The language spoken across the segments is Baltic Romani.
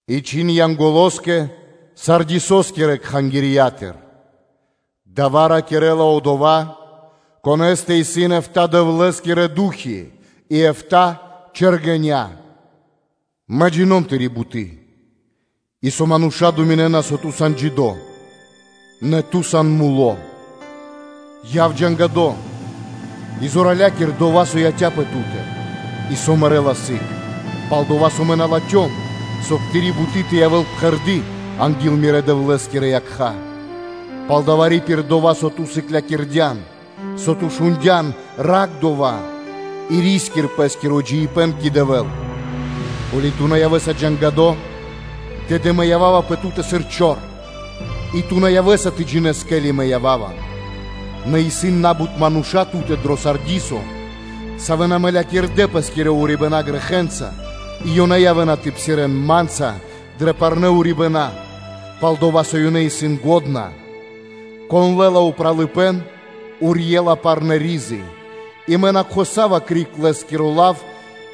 И чхин Янголоскэ Сардисоскирэ кхангирья́тыр: “Дава́ ракирэ́ла Одова́, Конэ́стэ исын эфта́ Дэвлэ́скирэ ду́хи и эфта́ чэргэня́: “Мэ джино́м (джина́в) тыри́ буты́, и со мануша́ дэн годы́ пэ́скэ (думинэ́на), со ту сан джидо́, нэ ту сан муло́. Ракхпэ и зоралякир дова́, со яця́пэ ту́тэ и со мэрэ́ла сыг, пал-дова́ со Мэ на латхём, соб (кай) тыри́ буты́ тэ явэ́л пхэрды́ анги́л Мирэ́ Дэвлэ́скирэ якха́. Палдава́ пририпир дова́, со ту сыклякирдян, со ту шундя́н, ракх да́ва и ри́скир пэ́скиро джиибэ́н кэ Дэвэ́л. Ко́ли ту на явэ́са тэ ракхэспэ, тэды Мэ ява́ва пэ ту́тэ сыр чор, и ту на явэ́са тэ джинэ́с, ке́ли мэ ява́ва. Нэ исын на́бут мануша́ ту́тэ дро Сардисо, савэ́ на мэлякирдэ пэ́скирэ урибэна́ грэхэ́нца, и ёнэ явэ́на тэ псирэ́н Ма́нца дрэ парнэ́ урибэна́, пал-дова́ со ёнэ исын лачхэ́. Кон лэ́ла упралыпэ́н, одова́ урьела парнэ́ ризы, и Мэ на кхосава криг лэ́скиро лав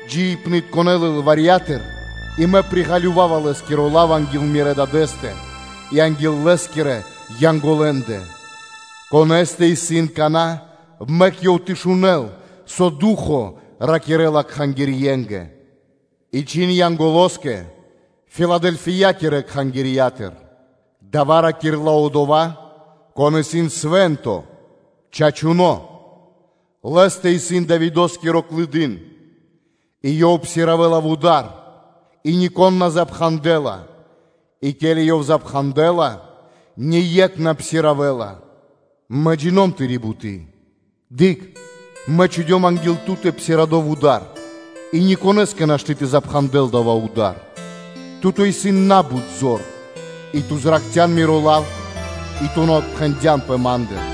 джиибнытконэ лылварьятыр (книгатыр), и мэ приґалёвава лэ́скиро лав анги́л мирэ́ Дадэ́стэ и анги́л Лэ́скирэ Янголэндэ, Конэ́стэ исын кана́, мэк ёв тэ шунэ́л, со Ду́хо (Фа́но) ракирэ́ла кхангирье́нгэ!” И чхин Янголоскэ Филадэльфиякирэ кхангирья́тыр: “Дава́ ракирэ́ла Одова́, Кон исын Свэ́нто, Чачуно́. Лэ́стэ исын Давидо́скиро клыдын и Ёв псиравэла (отпхандэла) вуда́р, и нико́н на пхандэла, и ке́ли Ёв пхандэла, ние́кх на псиравэла. Мэ джино́м тыри́ буты́. Дыкх: Мэ чхудём анги́л ту́тэ псирадо вуда́р и никонэ́скэ нашты́ тэ пхандэл дава́ вуда́р. Ту́тэ исын на́бут зор, и ту зракхця́н Миро лав и ту на отпхэндянпэ Ма́ндыр.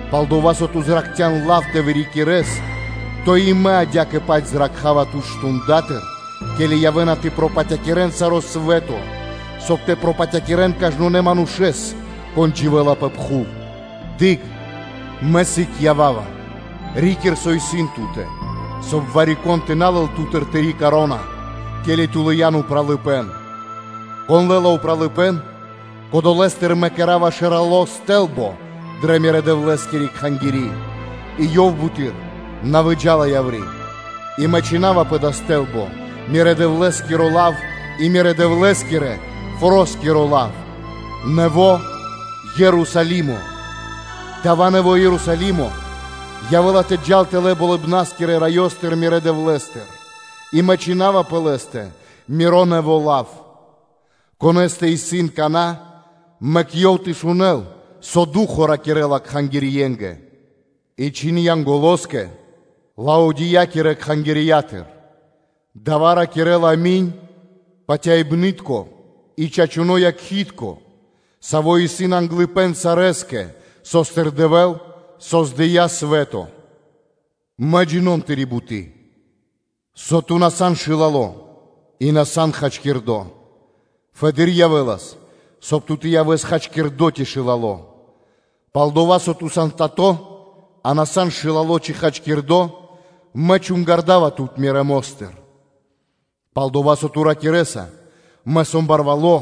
Палдава́ со ту ракхцян лав тэ вырикирэс, то и Мэ адя́кэ-паць ракхава тут мардэстыр (штундатыр), ке́ли явэ́на тэ пропатякирэн саро́ свэ́то, соб (кай) тэ пропатякирэн кажнонэ́ манушэ́с, кон дживэ́ла пэ пхув. Дыкх, Мэ сы́гэс ява́ва. Рикир, со исын ту́тэ, соб (кай) вари-кон тэ на лэл ту́тыр тыри́ вя́нка (коро́на), ке́ли ту лыян упралыпэ́н. Кон лэ́ла упралыпэ́н, кодолэстыр Мэ кэра́ва важно сты́лбо дрэ Мирэ́-Дэвлэ́скири Кхангири́, и ёв буты́р на выджа́ла яври́. И Мэ чхина́ва пэ дава́ сты́лбо Мирэ́ Дэвлэ́скиро лав, и Мирэ́-Дэвлэ́скирэ форо́скиро лав “Нэво́ Ерусалимо.” Дава́ нэво́ Ерусалимо явэ́ла тэ джал тэлэ́ Болыбна́скирэ Раёстыр, Мирэ́ Дэвлэ́стыр. И Мэ чхина́ва пэ лэ́стэ Миро нэво́ лав. Конэ́стэ исын кана́, мэк ёв тэ шунэ́л, со Ду́хо (Фа́но) ракирэ́ла кхангирье́нгэ.” И чхин Янголоскэ Лаодикиякирэ кхангирья́тыр: “Дава́ ракирэ́ла “Ами́нь”, патяибны́тко и чачуно́ Якхи́тко, Саво́ исын англыпэ́н сарэскэ, со́стыр Дэвэ́л создыя́ свэ́то: Мэ джино́м (джина́в) тыри́ буты́, со ту на сан шылало, и со ту на сан хачкирдо. Фэды́р явэ́лас, соб (кай) ту тэ явэс хачкирдо ци шылало. Палдава́ со ту сан тато, а ту на сан шылало ци хачкирдо, мэ чунгардава тут Мирэ́ мо́стыр. Пал-дова́ со ту ракирэ́са: ‘Мэ сом барвало́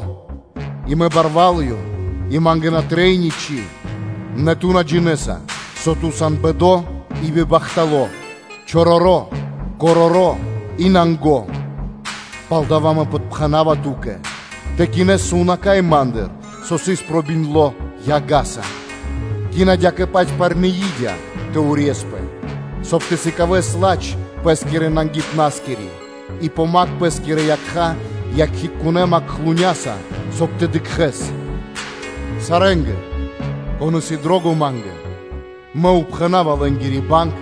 и мэ барвалыём и ма́нгэ на трэй ничы́, нэ ту на джинэ́са, со ту сан бэдо и бибахтало́; чороро́, короро́ и нанго;’ палдава́ мэ подпхэнава ту́кэ тэ кинэс сувнака́й Ма́ндыр, саво́ сыс пробиндло яга́са. Кин адя́кэ-паць парны и́дя тэ урьеспэ, соб (кай) тэ сыкавэс ладж пэ́скирэ нангипнаскири; и помакх пэ́скирэ якха́ якхитконэ макхлуняса (мазяса), соб (кай) тэ дыкхэ́с. Сарэ́нгэ, кон исын дро́го Ма́нгэ, Мэ пхэна́ва зорья́са лэ́нгири банг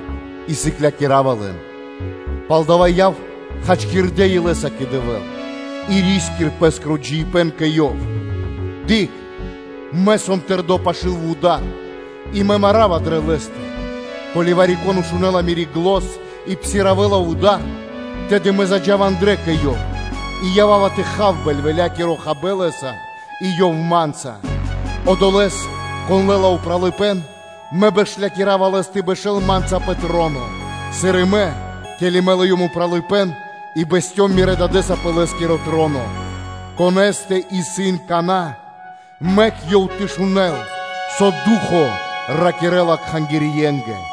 и сыклякирава лэн кэ дукха́. Палдава́ яв хачкирдэ́ илэ́са кэ Дэвэ́л и ри́скир пэ́скиро джиибэ́н кэ Ёв. Дыкх! Мэ сом тэрдо́ пашы́л вуда́р и марава дрэ лэ́стэ; ко́ли вари-кон шунэ́ла Мири́ зан и псиравэла (отпхандэла) вуда́р, тэды Мэ заджава андрэ́ кэ ёв и ява́ва тэ хав бэльвэлякиро хабэ́н лэ́са и ёв Ма́нца. Одолэ́с, кон лэ́ла упралыпэ́н, Мэ бэшлякирава лэс тэ бэшэ́л Ма́нца пэ троно, сыр и Мэ, ке́ли Мэ лыём упралыпэ́н и бэсцём Мирэ́ Дадэ́са пэ Лэ́скиро троно. Конэ́стэ исын кана́, мэк ёв тэ шунэ́л, со Ду́хо (Фа́но) ракирэ́ла кхангирье́нгэ.”